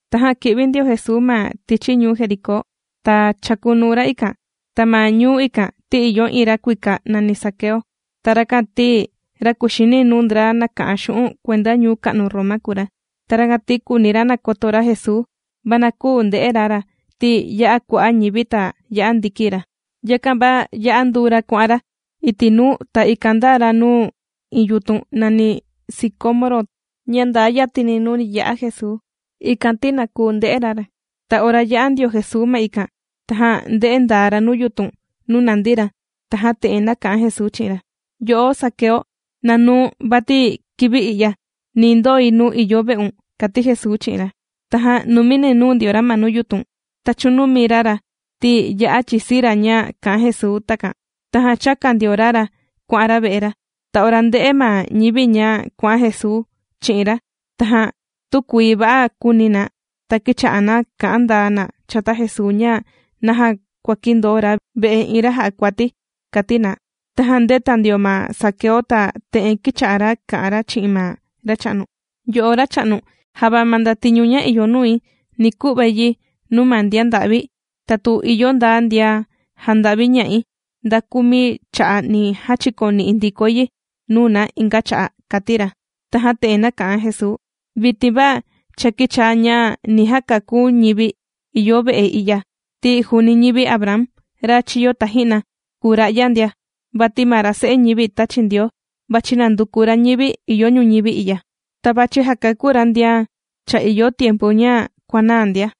Tajan kī'vi ndio Jesuu ma tichi ñuu Jericó. Ta chàkunuu ra ikan. Ta ma ñuu ikan ti ìyo iin ra kuika nàni Zaqueo. Ta rakan ti ra kùxini nuu ndra nàka'an xu'un' kuenda ñuu ka'nu Roma kùu ra. Ta rakan ti kùuni ra nakoto ra Jesuu, va na küu nde'e ra ra, ti ya'a kua'a' ñivi ta ya'a ndiki ra ndia. Yakan va yā'a nduu ra kuà'an ra iti' nuu, ta ikan ndāa ra nuu iin yutun nàni sicómoro ña ndaa yatini nuu ni ya'a Jesuu, ikan ti na kuu nde'e ra ra. Ta ora yā'a ndio Jesuu ma ikan, tajan ndē'e ndaa ra nuu yutun nuu nàndi ra, tajan te'en nāka'an Jesuu chi'in ra: ―Yo'o Zaqueo, na nuu̱n, vati kivi i'ya ni ndoi nuu ìyo ve'un ―kàti Jesuu chi'in ra. Tajan numini nūu ndio ra ma nuu yutun, ta chūnumi ra ra ti ya'a chìsii ra ña kā'an Jesuu takan. Tajan chāka ndio ra ra kuà'an ra ve'e ra. Ta ora ndē'e ma ñivi ña kuà'an Jesuu chi'in ra, tajan tükuii va'a kūuni na, ta kīcha'a na kà'an ndaa na chata Jesuu ña naja kuàkindoo ra ve'e iin ra jà'a kuati, kàti na. Tajan ndēta ndio ma Zaqueo ta te'en kīcha'a ra kà'an ra chi'in ma Racha'nu: ―Yo'o Racha'nu, java ma ndatiñu ña ìyo nui, ni ku'vai yi nuu ma ndian nda'vi, ta tu ìyo nda ndian jānda'viña'i, nda kumi cha'a' ni jachikoni'i ndikoi yi nuu na inga cha'a' ―kàti ra. Tajan te'en nāka'an Jesuu: ―Vitin va cha kīchaa ña ni kakú ñivi ìyo ve'e i'ya ti juuni ñivi Abraham ra chīyo taji'na kùu ra'ya ndia. Vati ma ra Se'e ñivi tāchi Ndioo, vàchi nanduku ra ñivi ìyo ñuñivi i'ya, ta vàchi jakakú ra ndian cha ìyo tiempu ña kuànaa ndia.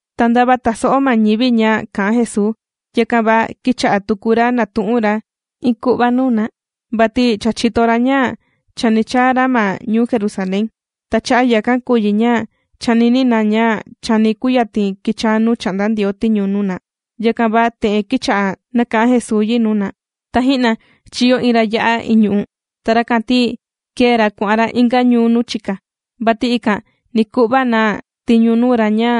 Ta ndava tàso'o ma ñivi ña kà'an Jesuu, yakan va kīcha'a tuku ra nàtu'un ra iin ku'va nuu na, vati cha chìto ra ña chani chaa ra ma ñuu Jerusalén. Ta cha'a' yakan kùu yi ña chànini na ña chani kuyatin kichaa nuu chà'nda Ndioo tiñu nuu na. Yakan va te'en kīcha'a nāka'an Jesuu yi nuu na: ―Taji'na, chīyo iin ra ya'a ìñu'u. Ta rakan ti kēe ra kuà'an ra inga ñuu nuu chika, vati ikan ni ku'va na tiñu nuu ra ña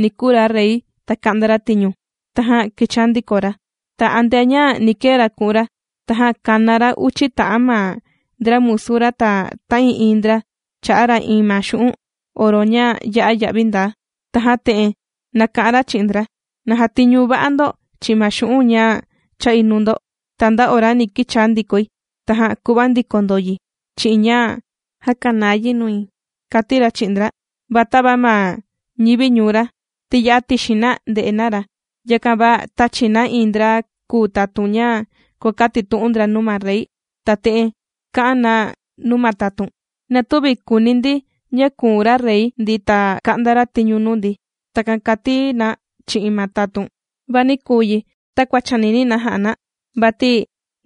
ni kuu ra Rey ta ka'nda ra tiñu, tajan kichaa ndiko ra. Ta antea ña ni kee ra ku'un ra, tajan kāna ra uchi ta'an ma ndra musu ra, ta ta'ii'iin ndra chā'a ra iin ma xu'un' oro ña ya'a ya'vi ndaa. Tajan te'en nāka'an ra chi'in ndra: “Na jatiñu va'a ndo chi'in ma xu'un' ña chā'i nuu ndo, ta nda ora ni kichaa ndikoi, tajan ku'va ndiko ndo yi chi'in ña jàkanaa yi nui”, kàti ra chi'in ndra. Va tava ma ñivi ñuu ra, ti ya'a tixin na nde'e na ra, yakan va tāchi na iin ndra kùu tatun ña kuàkatitu'un ndra nuu ma rey, ta te'en kà'an na nuu ma tatun: “Na tüvi kùuni ndi ña kùu ra Rey ndi, ta ka'nda ra tiñu nuu ndi.” Takan kàti na chi'in ma tatun. ’Va nī kuu yi takua chànini na ja'a na, vati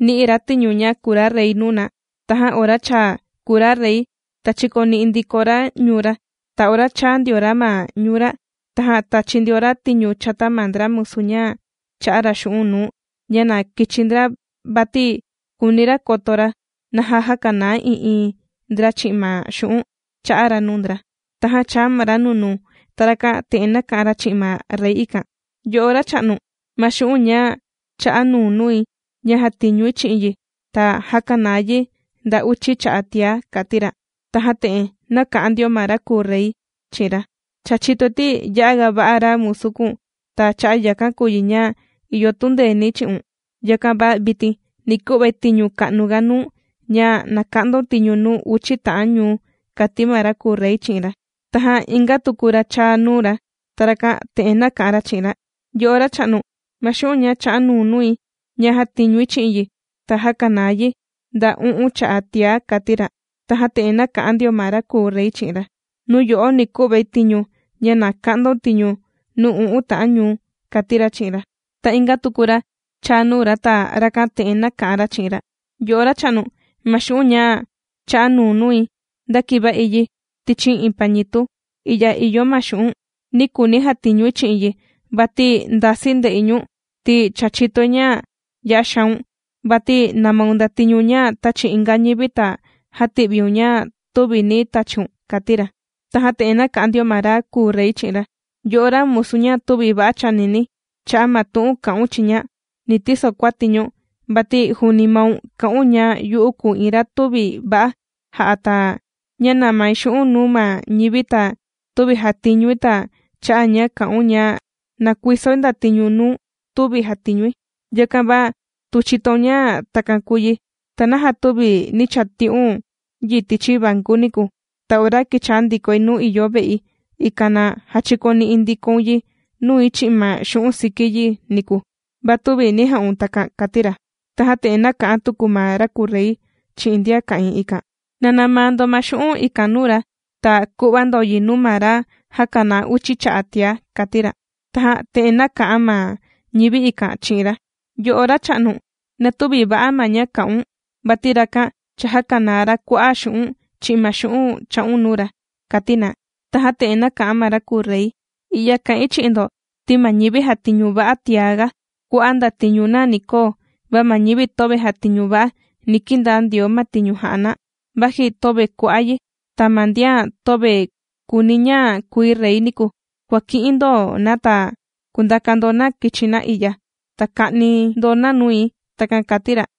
nì'i ra tiñu ña kùu ra Rey nuu na, tajan ora cha kùu ra rey ta chīkoni'i ndiko ra ñuu ra. Ta ora chāa ndio ra ma ñuu ra, tajan tāchi ndio ra tiñu chata ma ndra musu ña chā'a ra xu'un' nuu ña na kichi ndra vati kùuni ra koto ra naja jākanaa ii'iin ndra chi'in ma xu'un' chā'a ra nuu ndra. Tajan chāa ma ra nunuu, ta rakan te'en nāka'an ra chi'in ma rey ikan: “Yo'o racha'nu, ma xu'un' ña chā'a nuu̱n nui ña jātiñui chi'in yi ta jākanaa yi nda uchi cha'a' tiá”, kàti ra. Tajan te'en nāka'an ndio ma ra kùu Rey chi'in ra: “Cha chìtoi ti ya'a ga va'a ra musu kùu̱n, ta cha'a' yakan kùu yi ña ìyo tundeeni̱ chi'un. Yakan va vitin ni ku'vai tiñu ka'nu ga nuu̱n ña na ka'ndaun tiñu nuu uchi ta'an ñuu”, kàti ma ra kùu Rey chi'in ra. Tajan inga tuku ra chāa nuu ra. Ta rakan te'en nāka'an ra chi'in ra: “Yo'o racha'nu, ma xu'un' ña chā'a nuu̱n nui ña jàtiñui chi'in yi ta jākanaa yi nda u'un cha'a' tiá”, kàti ra. Tajan te'en nāka'an ndio ma ra kùu Rey chi'in ra: “Nuu yo'o ni ku'vai tiñu ña na ka'ndaun tiñu nuu u'un ta'an ñuu”, kàti ra chi'in ra. ’Ta inga tuku ra chāa nuu ra, ta rakan te'en nāka'an ra chi'in ra: “Yo'o racha'nu, ma xu'un' ña chā'a nuu̱n nui, ndākiva'i yi tichi iin pañitu, i'ya ìyo ma xu'u̱n'. Nī kuuni̱ jatiñui chi'in yi vati ndasii̱ nde'i ñu̱n, ti cha chìtoi ña ya'a xaun, vati nàmaun ndatiñu ña tāchi inga ñivi ta jàti'viun ña tüvi nī tachiun”, kàti ra. Tajan te'en nāka'an ndio ma ra kùu Rey chi'in ra: “Yo'o ra musu ña tüvi va'a chànini. Cha'a' ma tu'un kā'un chiña, ni tiso kuati̱ ñu̱n. Vati juuni maun kà'un ña yu'u kùu iin ra tüvi va'a jà'a, ta ña nàmai xu'un' nuu ma ñivi ta tüvi jàtiñui, ta cha'a' ña kà'un ña nakuisoi ndatiñu nuu tüvi jàtiñui. Yakan va tu chìtoun ña takan kùu yi, ¿ta naja tüvi nī chati'un yi tichi vanku niku, ta ora kichaa ndikoi nuu ìyo ve'i, ikan na jachikoni'i ndikoun yi nui chi'in ma xu'un' siki yi niku? Va tüvi nī ja'un takan”, kàti ra. Tajan te'en nāka'an tuku ma ra kùu Rey chi'in ndian ka'ìin ikan: “Na namaa ndo ma xu'un' ikan nuu ra, ta ku'va ndo yi nuu ma ra jākanaa uchi cha'a' tiá”, kàti ra. Tajan te'en nāka'an ma ñivi ikan chi'in ra: “Yo'o racha'nu, na tüvi va'a ma ña kā'un, vati rakan cha jākanaa ra kua'a' xu'un' chi'in ma xu'un' chā'un nuu ra”, kàti na. Tajan te'en nāka'an ma ra kùu Rey: “I'ya kà'in chi'in ndo ti ma ñivi jàtiñu va'a tiaga kua'a' ma ndatiñu na ni koo, va ma ñivi töve jàtiñu va'a, ni kindaa Ndioo ma tiñu jà'a na vaji töve kua'a' yi. Ta ma ndian töve kùuni ña kui Rey niku, kuàki'in ndo na ta kundaka ndo na kichi na i'ya, ta ka'ni ndo na nui.” Takan kàti ra.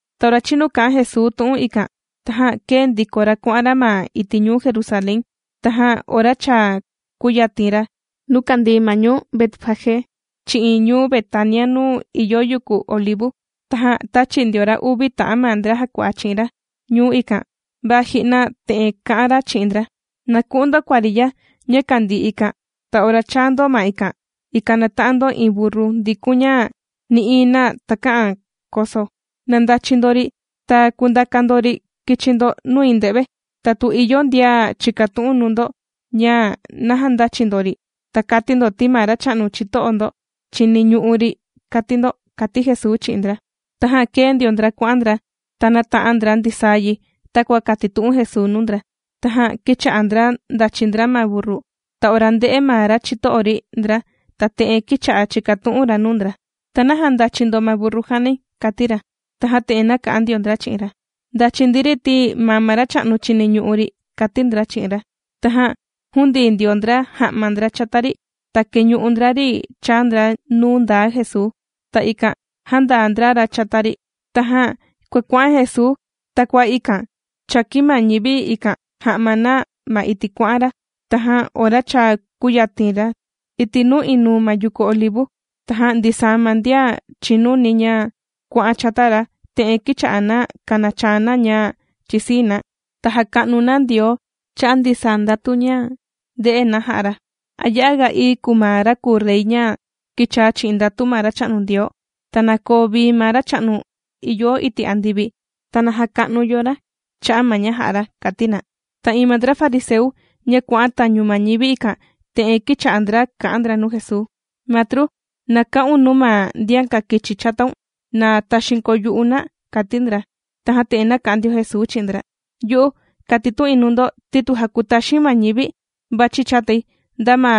Ta ora chinu kā'an Jesuu tu'un ikan, tajan kēe ndiko ra kuà'an ra ma iti' ñuu Jerusalén. Tajan ora cha kùyatin ra nuu kàndii ma ñuu Betfagé chi'in ñuu Betania nuu ìyo yuku Olivu, tajan tāchi ndio ra uvi ta'an ma ndra jàkua'a chi'in ra ñuu ikan, va ji'na te'en kā'an ra chi'in ndra: ―Na ku'un ndo kuariya ña kàndii ikan ta ora chaa ndo ma ikan, ikan nata'an ndo iin burru ndikun ña nï'iin na takä'an koso. Na ndachi ndo ri ta kundaka ndo ri kichi ndo nui nde've. Ta tu ìyo ndian chìkatu'un nuu ndo ña naja ndàchi ndo ri, ta kati ndo ti ma racha'nu chito'o ndo chiniñu'u ri kàti ndo ―kàti Jesuu chi'in ndra. Tajan kēe ndio ndra kuà'an ndra ta nāta'an ndra ndisaa yi takua kātitu'un Jesuu nuu ndra. Tajan kīcha'a ndra ndàchi ndra ma burru, ta ora ndē'e ma ra chito'o ri ndra, ta te'en kīcha'a chìkatu'un ra nuu ndra: ―¿Ta naja ndàchi ndo ma burru jànai? ―kàti ra. Tajan te'en nāka'an ndio ndra chi'in ra: ―Ndàchi ndi ri ti ma racha'nu chiniñu'u ri ―kàti ndra chi'in ra. Tajan jūndii ndio ndra ja'ma ndra chata ri ta kēñu'u ndra ri chāa ndra nuu ndaa Jesuu. Ta ikan jāndaa ndra ra chata ri. Tajan kuàkua'an Jesuu, ta kua ikan chàkin ma ñivi ikan ja'ma na ma iti' kuà'an ra. Tajan ora cha kūyatin ra iti' nuu inuu ma yuku Olivu, tajan ndisaa ma ndian chìnuni ña kuà'an chata ra, te'en kīcha'a na kànachaa na ña chìsii na. Ta jàka'nu na Ndioo cha'a' ndisaa ndatu ña ndè'e na jā'a ra: ―¡Ya'a ga ií kùu ma ra kùu Rey ña kīchaa chi'in ndatu ma Racha'nu Ndioo! ¡Ta na koo vii ma Racha'nu ìyo iti' andivi! ¡Ta na jaka'nu yo ra cha'a' ma ña jā'a ra! ―kàti na. Ta iin ma ndra fariseu, ña kuà'an tañu ma ñivi ikan, te'en kīcha'a ndra kà'an ndra nuu Jesuu: ―Matru, ¡na ka'un nuu ma ndian kàkichi chataun, na taxiin kuu yu'u na! ―kàti ndra. Tajan te'en nāka'an ndio Jesuu chi'in ndra: ―Yu'u kàtitu'in nuu ndo ti tu jakutaxi̱n ma ñivi vàchi chatai, nda ma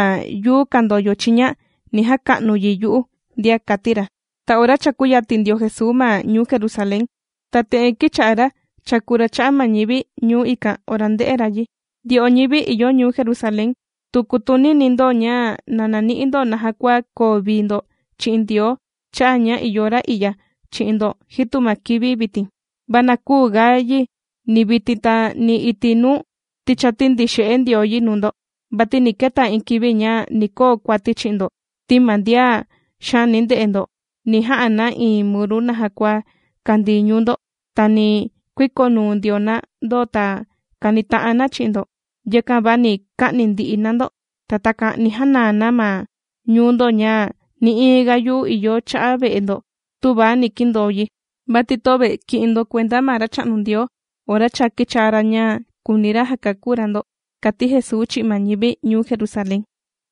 yuu kàndoyo chiña ni jaka'nu yi yu'u ndia ―kàti ra. Ta ora cha kūyatin ndio Jesuu ma ñuu Jerusalén, ta te'en kīcha'a ra chàku ra cha'a' ma ñivi ñuu ikan, ora ndē'e ra yi: ―Ndyo'o ñivi ìyo ñuu Jerusalén tu kutunini ndo ña na nani'i ndo naja kua koo vii ndo chi'in Ndioo cha'a' ña ìyo ra i'ya chi'in ndo jitu ma kivi vitin, va na küu ga yi ni vitin, ta ni iti' nuu, ti cha tīndixe'e Ndioo yi nuu ndo. Vati ni keta iin kivi ña ni koo kuati chi'in ndo ti ma ndian xaani nde'e ndo ni ja'a na iin muru naja kua kandii ñuu ndo, ta ni kuikonuu ndio na ndo ta kanita'an na chi'in ndo. Yakan va ni ka'ni ndi'i na ndo, ta takan ni janaa na ma ñuu ndo ña nï'iin ga yuu ìyo cha'a' ve'e ndo tüva ni kindoo yi, vati töve kì'in ndo kuenda ma Racha'nu Ndioo ora cha kīchaa ra ña kùuni ra jakakú ra ndo ―kàti Jesuu chi'in ma ñivi ñuu Jerusalén.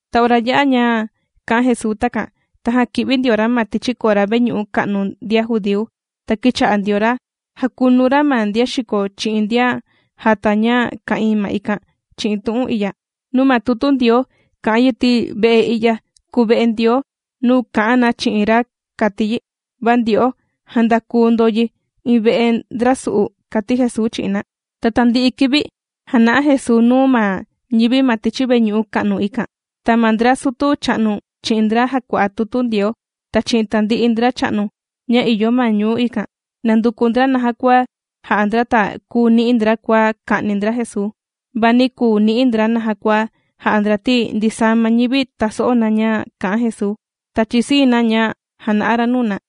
Ta ora yā'a ña kā'an Jesuu takan, tajan kī'vi ndio ra ma tichi kora veñu'u ka'nu ndian judíu, ta kīcha'a ndio ra jàkunu ra ma ndian xìko chi'in ndian jàta ña ka'ìin ma ikan chi'in tu'un i'ya: ―Nuu ma tutu Ndioo kà'an yi ti ve'e i'ya kùu ve'e Ndioo, nuu kà'an na chi'in ra kàti yi. Va ndyo'o, jāndaku ndo yi iin ve'e ndrasu'u ―kàti Jesuu chi'in na. Ta tandi'i kivi jàna'a Jesuu nuu ma ñivi ma tichi veñu'u ka'nu ikan, ta ma ndra sutu cha'nu chi'in ndra jàkua'a tutu Ndioo, ta chi'in tandi'i ndracha'nu ña ìyo ma ñuu ikan nànduku ndra naja kua ja'a ndra ta kuu ni'i ndra kua ka'ni ndra Jesuu. Va nī kuu ni'i ndra naja kua ja'a ndra ti ndisaa ma ñivi tàso'o na ña kà'an Jesuu, ta chìsii na ña jàna'a ra nuu na.